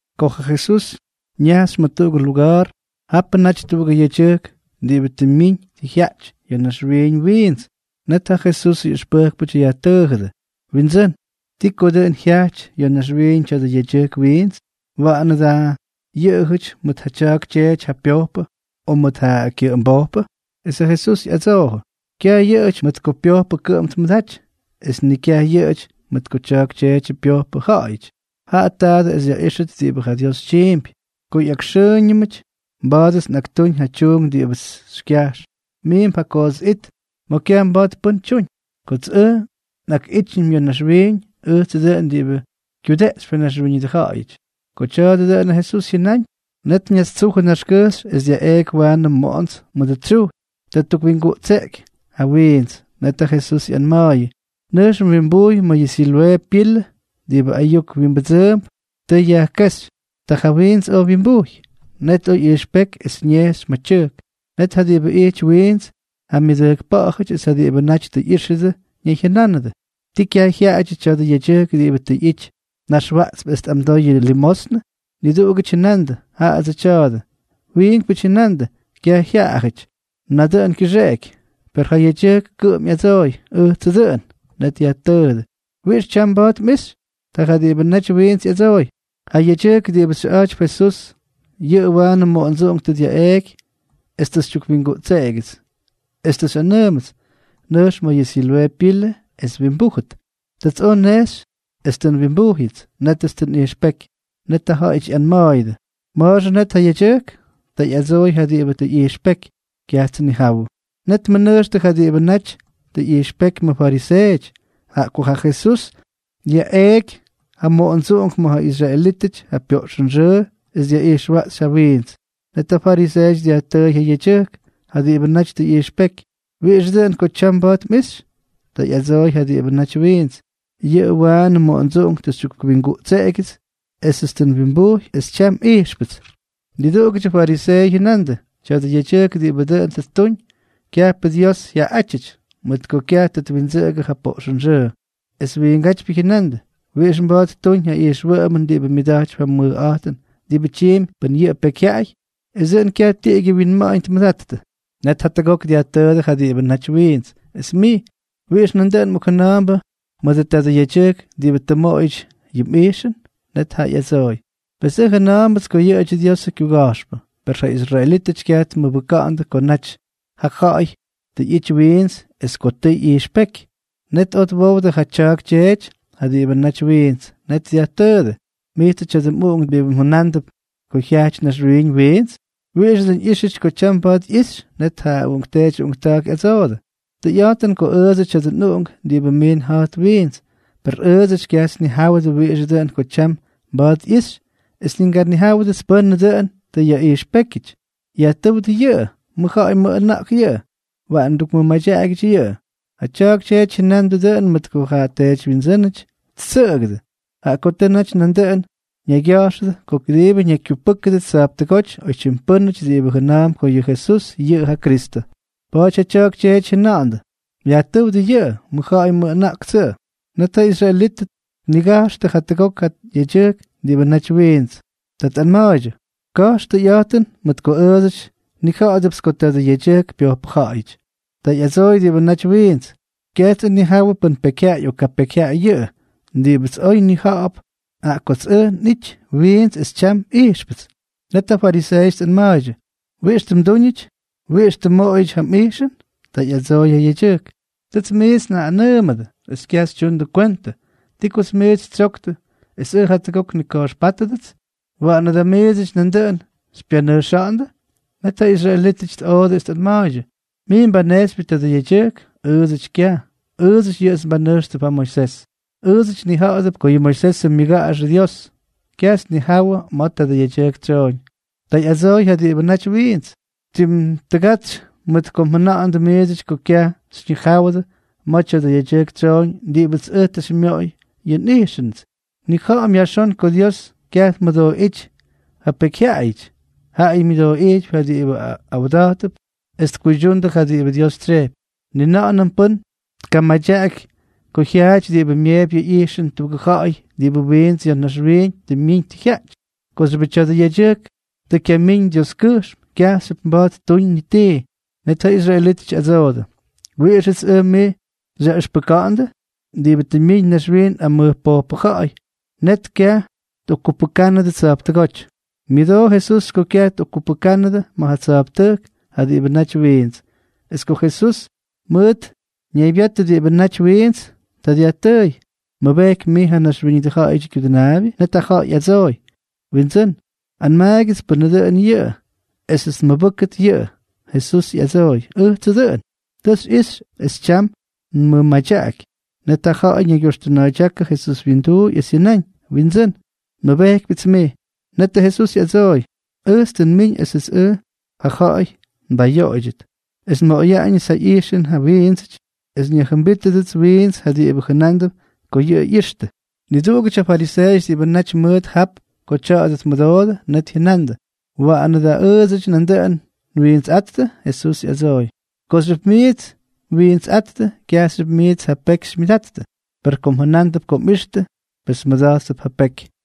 Ko ja Jesús ñajxy ma̱ tuꞌugʉ luga̱a̱r, japʉ naty tuꞌugʉ yedyʉjk diꞌibʉ tʉ myiñ tʉ jyaꞌty ya̱ naxwiiñ wiints. Net ja Jesusʉ ꞌyʉxpʉjkpʉty yajtʉʉjʉdʉ: —Windsʉ́n, ¿ti ko dʉꞌʉn jyajty ya̱ naxwiiñʉ tya̱dʉ yedyʉjk wiints? ¿Waꞌanʉ da yʉꞌʉjʉty mʉt ja tya̱a̱k tyeety ja pyojpʉ, o mʉt ja kyʉꞌʉmbojpʉ? Esʉ Jesús ꞌyadsoojʉ: —Kyaj yʉꞌʉjʉty mʉt ko pyojpʉ kʉꞌʉm tmʉdaty es ni kyaj yʉꞌʉjʉty mʉt ko tya̱a̱k tyeety pyojpʉ ja̱ꞌa̱yʉty, jaꞌa taadʉ es yaꞌíxʉt diꞌibʉ ja Dios tyiimpy. Ko ꞌyakxʉʉñʉmʉty, mba̱a̱dʉts nꞌaktúñ ja tyuunk diꞌibʉts xykyajx. Miimp ja koots it ma̱ kyaj mba̱a̱t pʉ́n tyuñ. Kots ʉj nꞌakꞌítyñʉm ya̱ naxwiiñ, ʉjtsʉ dʉꞌʉn diꞌibʉ kyudeꞌxypy ja naxwíñʉdʉ ja̱ꞌa̱yʉty. Ko tya̱a̱dʉ dʉꞌʉnʉ Jesús jyʉnáñ, net ñastsujʉ naxkʉjxy es dyaꞌeꞌky waanʉ moꞌonts mʉdʉ tsyujy. Ta ttukwingutseꞌky ja wiints. Net ja Jesús ꞌyanma̱a̱yʉ: —Nʉjx mwimbujy ma̱ yʉ Siloꞌee pilʉ (diꞌibʉ ayuk wimbʉdsʉʉmp Tʉ Yajkéxy). Ta ja wiints oj wyimbujy. Net oj ꞌyijxpéky es ñejxy ma̱ tyʉjk. Net ja diꞌibʉ ijty wiints ja myʉdʉjkpa̱ꞌa̱jʉty es ja diꞌibʉ naty tʉ ꞌyíxʉdʉ ñayjyʉnánʉdʉ: —¿Ti kyaj jyaꞌajʉdyʉ tya̱dʉ yedyʉjk diꞌibʉ tʉ ꞌyity naxwaꞌtsp es tꞌamdoy yʉ limosnʉ? Niduꞌugʉty jyʉnandʉ: —Jaꞌadsʉ tya̱a̱dʉ. Wiinkpʉty jyʉnandʉ: —Kyaj jyaꞌajʉty, nadʉꞌʉn kyʉxeꞌeky. Per ja yedyʉjk kʉꞌʉm ꞌyadsooy: —Ʉjtsʉ dʉꞌʉn. Net dyajtʉʉdʉ: —¿Wiꞌix tyam mba̱a̱t mꞌixy? Ta ja diꞌibʉ naty wiints ꞌyadsooy: —Ja yedyʉjk diꞌibʉ xyʉꞌa̱jtypy Jesús, yʉꞌʉ waanʉ moꞌondsuꞌunk tʉ dyaꞌeeky es tʉ xytyukwingutseꞌegyʉts, es tʉ xyꞌanʉʉmʉts: “Nʉjx ma̱ yʉ Siloꞌee pilʉ es mwimbújʉt.” Tats oj nnejxy es tʉ nwimbujyʉts. Nétʉts tʉ nꞌijxpéky. Net ja ja̱ꞌa̱yʉty ꞌyanma̱a̱yʉdʉ: —¿Ma̱a̱xʉ net ja yedyʉjk? Ta ꞌyadsooy ja diꞌibʉ tʉ ꞌyijxpéky: —Kyajts nnijawʉ. Net tmʉnʉjxtʉ ja diꞌibʉ naty tʉ ꞌyijxpéky ma̱ fariseeʉty, jaꞌa ko ja Jesús dyaꞌeꞌky ja moꞌondsuꞌunk ma̱ ja israelítʉty ja pyoꞌxʉnxʉʉ es dyaꞌijxwaꞌxy ja wiints. Net ja fariseeʉty dyajtʉ́y ja yedyʉjk, ja diꞌibʉ naty tʉ ꞌyijxpéky: —¿Wiꞌixʉ dʉꞌʉn ko tyam mba̱a̱t mꞌixy? Ta ꞌyadsooy ja diꞌibʉ naty wiints: —Yʉꞌʉts waanʉ moꞌondsuꞌunk tʉ xytyukwingutseꞌegyʉts, oj nwimbujy, es tyam nꞌijxpʉts. Niduꞌugʉdyʉ fariseeʉty jyʉnandʉ: —Tya̱dʉ yedyʉjk diꞌibʉ dʉꞌʉn tʉ ttuñ, kyajpʉ Dios jyaꞌaꞌátyʉty, mʉt ko kyaj tʉ twindsʉꞌʉgʉ ja poꞌxʉnxʉʉ. Es wiingátypyʉ jyʉnandʉ: —¿Wiꞌix mba̱a̱t ttuñ ja ijxwʉꞌʉmʉn diꞌibʉ myʉda̱jtypy ja mʉjꞌa̱jtʉn diꞌibʉ tyiimpy pʉn yʉꞌʉ pekyjyaꞌay? Esʉ dʉꞌʉn kyaj tiꞌigyʉ winma̱ꞌa̱ñ tmʉdattʉ. Net jatʉgok dyajtʉʉdʉ ja diꞌibʉ naty wiints: —Es mij, ¿wiꞌix nandʉꞌʉn mꞌokjʉna̱a̱mbʉ mʉdʉ tadʉ yedyʉjk diꞌibʉ tʉ mmoꞌoyʉty yʉ mꞌijxʉn? Net jaꞌa ꞌyadsooy: —Pes ʉj jʉna̱a̱mbʉts ko yʉꞌʉdyʉ Diosʉ kyuga̱jxpʉ. Per ja israelítʉty kyaj tmʉbʉkandʉ ko naty ja ja̱ꞌa̱y tʉ ꞌyity wiints es ko tʉʉ ꞌyijxpéky. Net oj twowdʉ ja tya̱a̱k tyeety ja diꞌibʉ naty wiints. Net dyajtʉʉdʉ: —¿Mijtsʉ tya̱dʉ mꞌuꞌunk diꞌibʉ mjʉnándʉp ko jyajty naxwiiñ wiints? ¿Wiꞌixʉ dʉꞌʉn ꞌyíxyʉty ko tyam mba̱a̱t ꞌyixy? Net ja uꞌunkteety uꞌunkta̱a̱k ꞌyadsoodʉ: —Tʉyꞌa̱jtʉn ko ʉʉdsʉdyʉ tya̱dʉ nꞌuꞌunk diꞌibʉ miin ja̱jt wiints. Per ʉʉdsʉty kyajts nnijáwʉdʉ wiꞌixʉ dʉꞌʉn ko tyam mba̱a̱t ꞌyixy es ni nganijáwʉdʉts pʉ́nʉ dʉꞌʉn tʉ yaꞌijxpékyʉty. Yajtʉ́wdʉ yʉꞌʉ. Mʉj ja̱ꞌa̱y mʉj ʉna̱ꞌk yʉꞌʉ. Waꞌan mdukmʉmadyaꞌagyʉty yʉꞌʉ. Ja tya̱a̱k tyeety jyʉnandʉ dʉꞌʉn mʉt ko ja teedywyindsʉ́nʉty ttsʉꞌʉgʉdʉ, jaꞌa ko tʉ naty nandʉꞌʉn ñaygya̱jxʉdʉ ko kʉdiibʉ ñakykyupʉ́kʉdʉt tsa̱jptʉgóty oytyim pʉ́nʉty diꞌibʉ jʉna̱a̱mp ko yʉ Jesús yʉꞌʉ ja Kristʉ. Pa̱a̱ty ja tya̱a̱k tyeety jyʉnandʉ: “Yajtʉ́wdʉ yʉꞌʉ. Mʉjja̱ꞌa̱y mʉjꞌʉna̱ꞌk yʉꞌʉ.” Net ja israelítʉty tnigajxʉ jatʉgok ja yedyʉjk diꞌibʉ naty wiints. Ta tꞌanma̱a̱ydyʉ: —Ka̱jx tʉyꞌa̱jtʉn, mʉt ko ʉʉdsʉty nnija̱ꞌa̱dʉpts ko tadʉ yedyʉjk pyojpʉja̱ꞌa̱yʉty. Ta ꞌyadsooy diꞌibʉ naty wiints: —Kyajts ʉj nnijawʉ pʉn pekyjyaꞌay o kapekyjyaꞌay yʉꞌʉ. Diꞌibʉts oy nnijawʉ, jaꞌa kots ʉj tʉ nꞌity wiints es tyam ijxpʉts. Net ja fariseeʉty tꞌanma̱a̱ydyʉ: —¿Wiꞌix tʉ mdúñʉty? ¿Wiꞌix tʉ mmoꞌoyʉty ja mꞌijxʉn? Ta ꞌyadsooy ja yedyʉjk: —Tʉts miits njaꞌꞌanʉʉmʉdʉ es kyaj xytyundʉ kwentʉ. ¿Ti ko miits xytsyoktʉ es ʉj jatʉgok nnika̱jxpátʉdʉts? ¿Waꞌanʉ da miidsʉty nandʉꞌʉn xypyanʉjxa̱ꞌa̱ndʉ? Net ja israelítʉty tꞌoodʉ es tꞌanma̱a̱ydyʉ: —Mij mbanejxypyʉ tadʉ yedyʉjk. ¡Ʉʉdsʉty kyaj! Ʉʉdsʉty yʉꞌʉts mbanʉjxtʉp yʉ Moisés. Ʉʉdsʉty nnija̱ꞌa̱dʉp ko yʉ Moisés myʉga̱jxʉ Dios. Kyajts nnijáwʉdʉ ma̱ tadʉ yedyʉjk tsyooñ. Ta ꞌyadsooy ja diꞌibʉ naty wiints: —¡Tim tʉgatsy mʉt ko mjʉna̱ꞌa̱ndʉ miidsʉty ko kyaj xyñijáwʉdʉ ma̱ tya̱dʉ yedyʉjk tsyooñ diꞌibʉts ʉj tʉ xymyoꞌoy yʉ nꞌijxʉnʉts! Nnija̱ꞌa̱m yajxón ko Dios kyaj tmʉdooꞌíty ja pekyjyaꞌayʉty, jaꞌayʉ myʉdooꞌijtypy ja diꞌibʉ awda̱jttʉp es tkuydyundʉ ja diꞌibʉ Dios tsyejpy. Ni na̱ꞌa̱nʉm pʉ́n tkamadyaꞌaky ko jyaaty diꞌibʉ myeepy yʉ ꞌyijxʉn tuꞌugʉ ja̱ꞌa̱y diꞌibʉ wiints ya̱ naxwiiñ tʉ myiñ tʉ jyaꞌty. Kooxyʉbʉ tya̱dʉ yedyʉjk tʉ kyamíñ Dioskyʉjxm, kyajxyʉp mba̱a̱t ttuñ ni tii. Net ja israelítʉty ꞌyadsoodʉ: —¿Wiꞌixʉts ʉj mij xyaꞌʉxpʉka̱ꞌa̱ndʉ?, diꞌibʉ tʉ mmiñ naxwiiñ amʉj pojpʉ ja̱ꞌa̱y. Net kyaj tꞌokkupʉjknʉdʉ tsa̱jptʉgóty. Myʉdoo Jesús ko kyaj tꞌokkupʉjknʉdʉ ma̱ ja tsa̱jptʉjk ja diꞌibʉ naty wiints. Es ko Jesús mʉt ñaybyatʉ diꞌibʉ naty wiints, ta dyajtʉʉy: —¿Mmʉbejkypy mij ja Naxwíñʉdʉ Ja̱ꞌa̱yʉdyʉ Kyudʉnaabyʉ? Net ja ja̱ꞌa̱y ꞌyadsooy: —Windsʉ́n, anmaagyʉts pʉ́nʉ dʉn yʉꞌʉ, esʉts nmʉbʉ́kʉt yʉꞌʉ. Jesús ꞌyadsooy: —Ʉjtsʉ dʉꞌʉn. Tʉ xyꞌixy es tyam nmʉmadyaꞌaky. Net ja ja̱ꞌa̱y ñaygyoxtʉna̱a̱ydyákʉ Jesús wyinduuy, es jyʉnáñ: —Windsʉ́n, nmʉbejkypyʉts mij. Netʉ Jesús ꞌyadsooy: —Ʉjts tʉ nmiñ esʉts ʉj ja ja̱ꞌa̱y nbayoꞌoydyʉt, es nmoꞌoyaꞌañʉts ja ꞌyijxʉn ja wiindsʉty es nyajjʉmbítʉdʉts wiints ja diꞌibʉ jʉnándʉp ko yʉꞌʉ ꞌyixtʉ. Niduꞌugʉty ja fariseeʉty diꞌibʉ naty mʉʉt jap ko tya̱a̱dʉ tmʉdoodʉ, net jyʉnandʉ: —¿Waꞌanʉ da ʉʉdsʉty nandʉꞌʉn nwiintsꞌáttʉ? Jesús ꞌyadsooy: —Kooxyʉp miits mwiintsꞌáttʉ, kyajxyʉp miits ja peky xymyʉdattʉ. Per kom mjʉnándʉp ko mꞌixtʉ, pes mmʉda̱jttʉp ja peky.